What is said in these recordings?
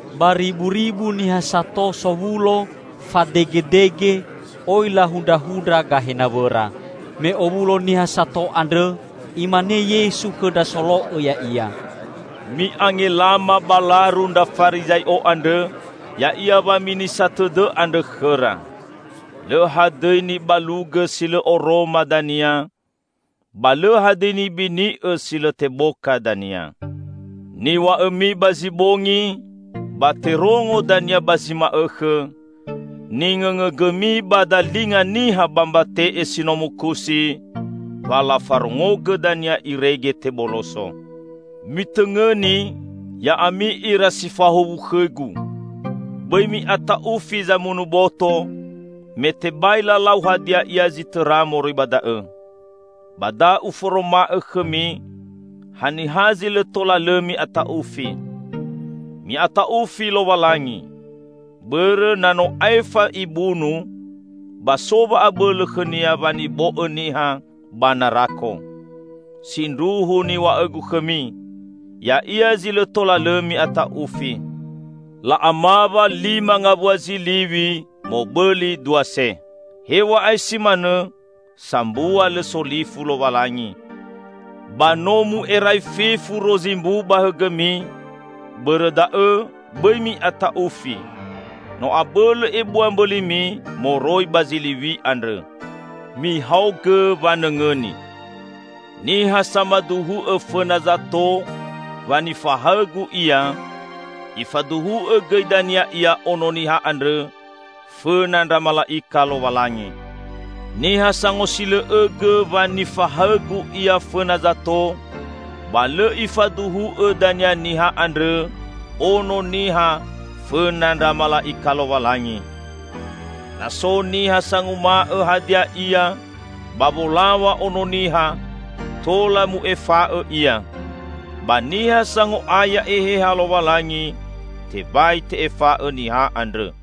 Bariburibu niha sato sowulo fadegedege, oi lahundrahundra gahe nawõra. Me owulo niha sato andrõ, Imane Yesu khõ ndra solo'õ Ya'ia, "Mi'angelama ba laru ndra Farizai'o andrõ, ya'ia waminisa tõdõ andrõ khõra. Lõ hadõi nibalugõ si lõ oroma dania, ba lõ hadõi nibini'õ si lõ teboka dania. Niw̃a'õmi ba zi bongi, ba terongo dania ba zi ma'õkhõ; ningõngõgõmi ba dalinga niha ba mbate'e si no mukusi, ba lafarongogõ dania irege teboloso." "Mitõngõni, ya'ami ira si fahuwu khõ-Gu! Bõi mi'ata'ufi zamunu boto, me tebai lalau hadia ia zi tõra moroi ba da'õ. Ba da Uforoma'õ khõmi haniha zi lõ tola lõ mi'ata'ufi. Mi'ata'ufi Lowalangi! Bõrõ na no aefa Ibunu, ba so wa'abõlõ khõ-Nia wanibo'õ niha ba narako! Sindruhu niw̃a'õ-Gu khõmi, Ya'ia zi lõ tola lõ mi'ata'ufi. La'amawa lima ngawua ziliw̃i mobõli dua se. Hew̃a'ae si manõ sambua lõ solifu Lowalangi. Ba no mu'erai fefu rozi mbu ba hõgõmi, bõrõ da'õ bõi mi'ata'ufi; no abõlõ ebua mbõlimi moroi ba ziliw̃i andrõ!" "Mihaogõ wanõngõni: Niha samaduhu'õ fõna zato wa nifahaõ-Gu ia, Ifaduhu'õ gõi dania ia Ono Niha andrõ fõna ndra mala'ika Lowalangi. Niha sangosilõ'õgõ wa nifahaõ-Gu ia fõna zato ba lõ Ifaduhu'õ dania niha andrõ Ono Niha fõna ndra mala'ika Lowalangi. Na so niha sanguma'õ hadia ia ba wolaw̃a Ono Niha, tola mu'efa'õ ia; ba niha sango'aya Eheha Lowalangi, tebai te'efa'õ niha andrõ.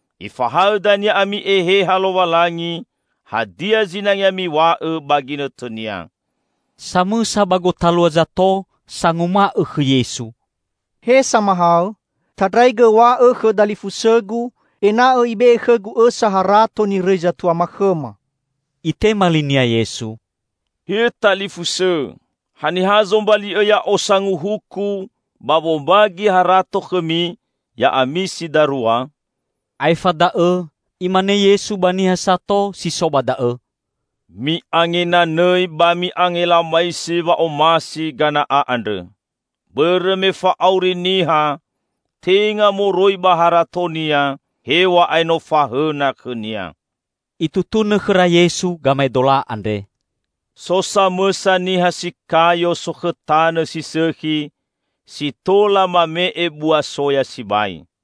Ifahaõ dania ami Eheha Lowalangi hadia zinangea miw̃a'õ ba ginõtõnia." Samõsa ba gotalua zato sanguma'õ khõ Yesu, "He Samahaõ, tandraigõ w̃a'õ khõ dalifusõgu ena'õ ibe'e khõgu õsa harato nirõi zatuama khõma." Itema linia Yesu, "He talifusõ, haniha zombali'õ Ya'o sanguhuku ba wombagi harato khõmi ya'ami si darua?" Aefa da'õ Imane Yesu ba niha sato si so ba da'õ, "Mi'angenanõi ba mi'angelamaisi wa'omasi gana'a andrõ. Bõrõ me fa'auri niha tenga moroi ba haratonia, hew̃a'ae no fahõna khõnia." Itutunõ khõra Yesu gamaedola andre, "So samõsa niha si kayo sokhõ tanõ si sõkhi, si tola mame'e bua soya sibai.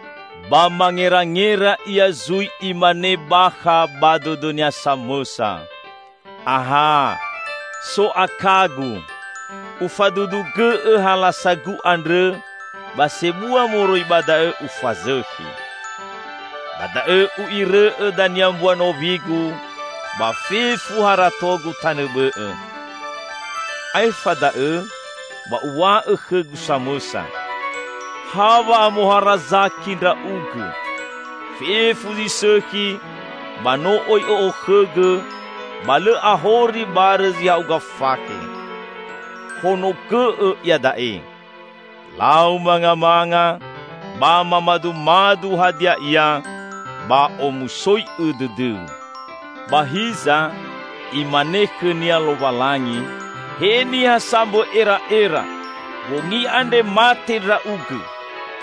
Ba mangerangera ia zui imane bakha ba dõdõnia samõsa, 'Aha, so akagu! Ufadudugõ'õ halasagu andrõ, ba sebua moroi ba da'õ ufazõkhi. Ba da'õ u'irõ'õ dania mbua nowigu ba fefu haratogu tanõ bõ'õ. Aefa da'õ ba uw̃a'õ khõgu samõsa: Ha wa'amoharazaki ndra'ugõ! Fefu zi sõkhi ba no oi õ'okhõgõ, ba lõ ahori barõ zi ha'uga fakhe. Honogõ'õ iada'e! Lau mangamanga ba mamadumadu hadia ia ba omusoi'õ dõdõu!' Ba hiza, Imane khõnia Lowalangi, 'He niha sambõ era'era! Bongi andre mate ndra'ugõ!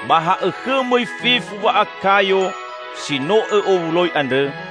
Ba ha'õkhõ mõi fefu wa'akayo si no õ'owuloi andrõ?'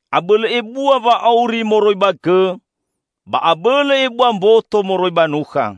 Abõlõ ebua wa'auri moroi ba gõ, ba abõlõ ebua mboto moroi ba nukha.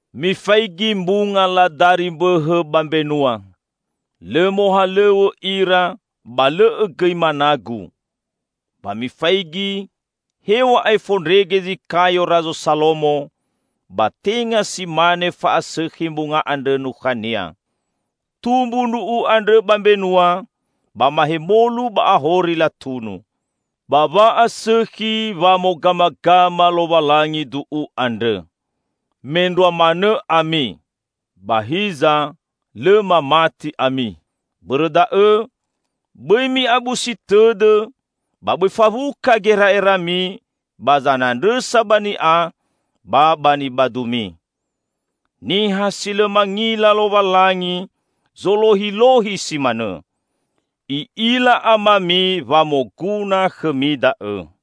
Mifaigi mbunga ladari mbõhõ ba mbenua; lõ mohalõw̃õ ira, ba lõ'õ gõi managu. Ba mifaigi: Hew̃a'ae fondrege zi kayo Razo Salomo, ba tenga si mane fa'asõkhi mbunga andrõ nukhania! Tumbu ndru'u andrõ ba mbenua, ba mahemolu ba ahori latunu. Ba wa'asõkhi wamogamagama Lowalangi du'u andrõ. Mendrua manõ ami! Ba hiza, lõ mamati ami! Bõrõ da'õ, bõi mi'abusi tõdõ ba bõi fawuka gera'erami ba zanandrõsa ba ni'a ba ba nibadumi. Niha si lõ mangila Lowalangi zolohilohi si manõ. I'ila Amami wa moguna khõmi da'õ.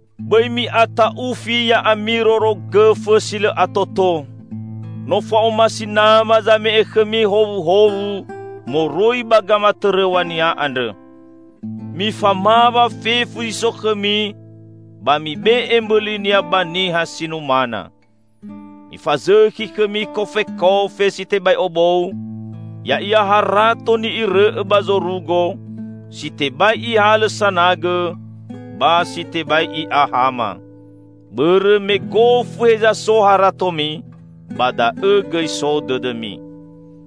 "Bõi mi'ata'ufi, ya'ami rorogõfõ si lõ atoto! No fa'omasi Nama zame'e khõmi howuhowu moroi ba gamatõrõw̃a-Nia andrõ. Mifamawa fefu zi so khõmi ba mibe'e mbõlinia ba niha si numana. Mifazõkhi khõmi kofekofe si tebai obou, ya'ia harato ni'irõ'õ ba zorugo si tebai ihalõ sanagõ ba si tebai i'a hama. Bõrõ me gofu heza so haratomi, ba da'õ gõi so dõdõmi!"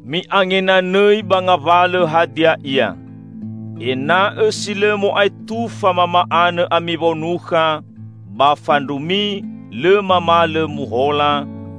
"Mi'angenanõi ba ngawalõ hadia ia. Ena'õ si lõ mo'aetufa mama'anõ ami wonukha ba fandrumi lõ mamalõ muhola,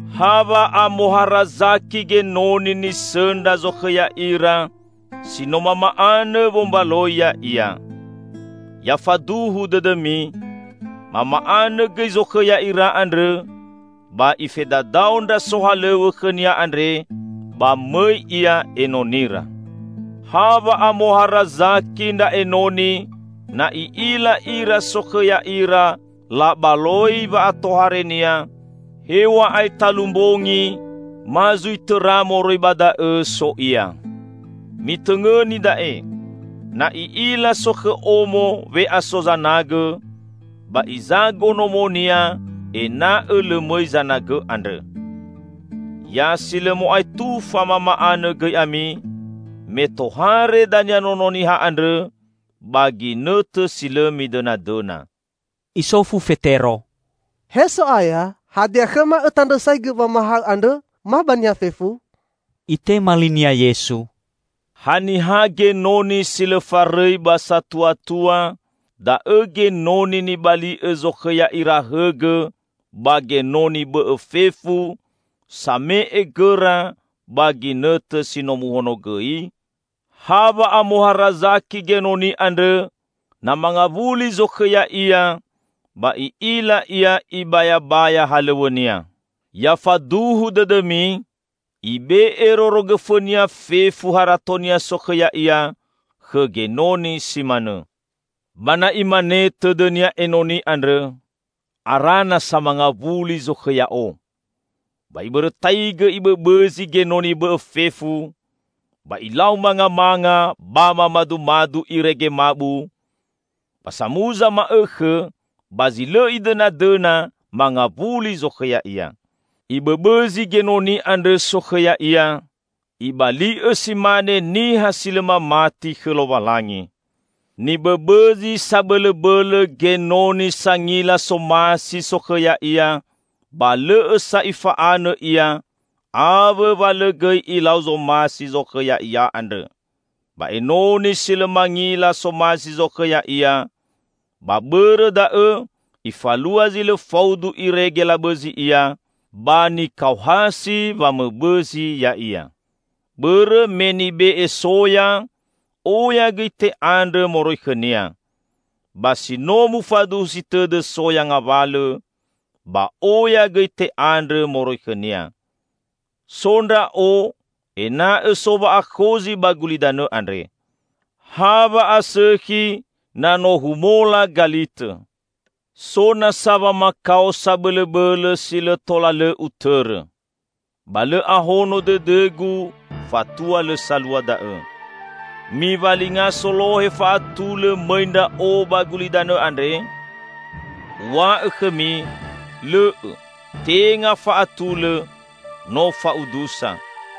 Ha wa'amoharazaki genoni nisõndra zokhõ ya'ira si no mama'anõ wombaloi ya'ia. Ya faduhu dõdõmi: Mama'anõ gõi zokhõ ya'ira andrõ, ba ifedadao ndra sohalõw̃õ khõnia andre, ba mõi ia enonira. Ha wa'amoharazaki ndra enoni na i'ila ira sokhõ ya'ira labaloi wa'atoharenia, hew̃a'ae talu mbongi ma zui tõra moroi ba da'õ so ia! Mitõngõni da'e! Na i'ila sokhõ omo we'aso zanagõ, ba izago nomonia ena'õ lõ mõi zanagõ andrõ. Ya si lõ mo'aetufa mama'anõ gõi ami, me tohare dania Nono Niha andrõ ba ginõtõ si lõ midõnadõna." Isofu Fetero, "He So'aya, hadia khõma Õtandrõsaigõ wamahaõ andrõ ma ba niha fefu?" Itema linia, Yesu, "Haniha genoni si lõ farõi ba satuatua, da'õ genoni nibali'õ zokhõ ya'ira hõgõ ba genoni bõ'õ fefu same'e gõra ba ginõtõ si no muhonogõi? Ha wa'amoharazaki genoni andrõ, na mangawuli zokhõ ya'ia ba i'ila ia ibayabaya halõw̃õnia! Ya faduhu dõdõmi: ibe'e rorogõfõnia fefu haratonia sokhõ ya'ia khõ genoni si manõ. Ba na imane tõdõnia enoni andrõ: 'Ara nasa mangawuli zokhõ ya'o,' ba ibõrõtaigõ ibõbõzi genoni bõ'õ fefu, ba ilau mangamanga ba mamadumadu irege mabu, ba samuza ma'õkhõ, ba zi lõ idõnadõna, mangawuli zokhõ ya'ia. Ibõbõzi genoni andrõ sokhõ ya'ia, ibali'õ si mane niha si lõ mamati khõ Lowalangi. Nibõbõzi sabõlõbõlõ genoni sangila somasi zokhõ ya'ia ba lõ'õ sa ifa'anõ ia awõ wa lõ gõi ilau zomasi zokhõ ya'ia andrõ. Ba enoni si lõ mangila somasi zokhõ ya'ia, ba bõrõ da'õ ifalua zi lõ faudu irege labõzi ia, ba nikaohasi wamõbõzi ya'ia. Bõrõ me nibe'e soya, oya gõi te'andrõ moroi khõnia. Ba si no mufaduhusi tõdõ soya ngawalõ, ba oya gõi te'andrõ moroi khõnia." "So Ndra'o ena'õ so wa'akhozi ba gulidanõ andre. Ha wa'asõkhi na no humola galitõ! So nasa wamakao sabõlõbõlõ si lõ tola lõ Utõrõ. Ba lõ ahono dõdõ-Gu fatua lõ salua da'õ. Miwalinga solohe fa'atulõ mõi Ndra'o ba gulidanõ andre? Uw̃a'õ khõmi, lõ'õ, tenga fa'atulõ, no fa'udusa.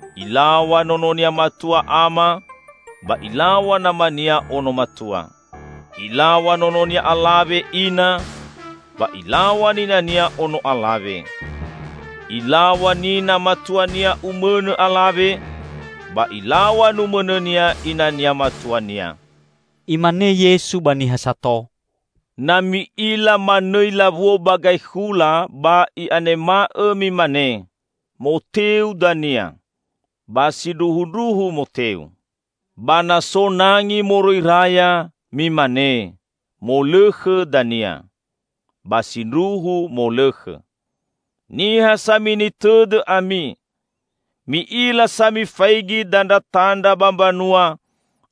Ilaw̃a nononia matua ama ba ilaw̃a namania ono matua. Ilaw̃a nononia alawe ina ba ilaw̃a ninania ono alawe. Ilaw̃a nina matuania umõnõ alawe ba ilaw̃a numõnõnia inania matuania." Imane Yesu ba niha sato, "Na mi'ila manõi lawuo ba gaekhula ba i'anema'õ mimane, 'Moteu dania.' Ba sindruhundruhu moteu. Ba na so nangi moroi raya, mimane, 'Molõkhõ dania.' Ba sindruhu molõkhõ. Niha samini tõdõ ami! Mi'ila sa mifaigi dandratandra ba mbanua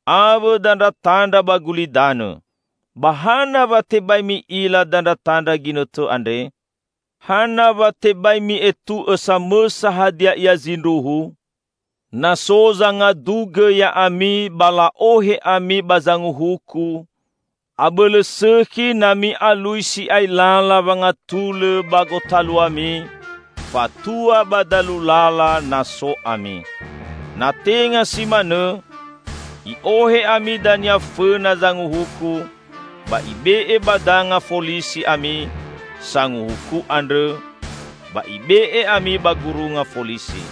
awõ dandratandra ba gulidanõ. Ba hana wa tebai mi'ila dandratandra ginõtõ andre?" "Hana wa tebai mi'etu'õ samõsa hadia ia zindruhu? Na so zangadugõ ya'ami ba la'ohe ami ba zanguhuku, abõlõ sõkhi na mi'alui si'ai lala wangatulõ ba gotaluami fatua ba dalu lala na so ami. Na tenga si manõ, i'ohe ami dania fõna zanguhuku ba ibe'e ba danga folisi ami sanguhuku andrõ, ba ibe'e ami ba gurunga folisi.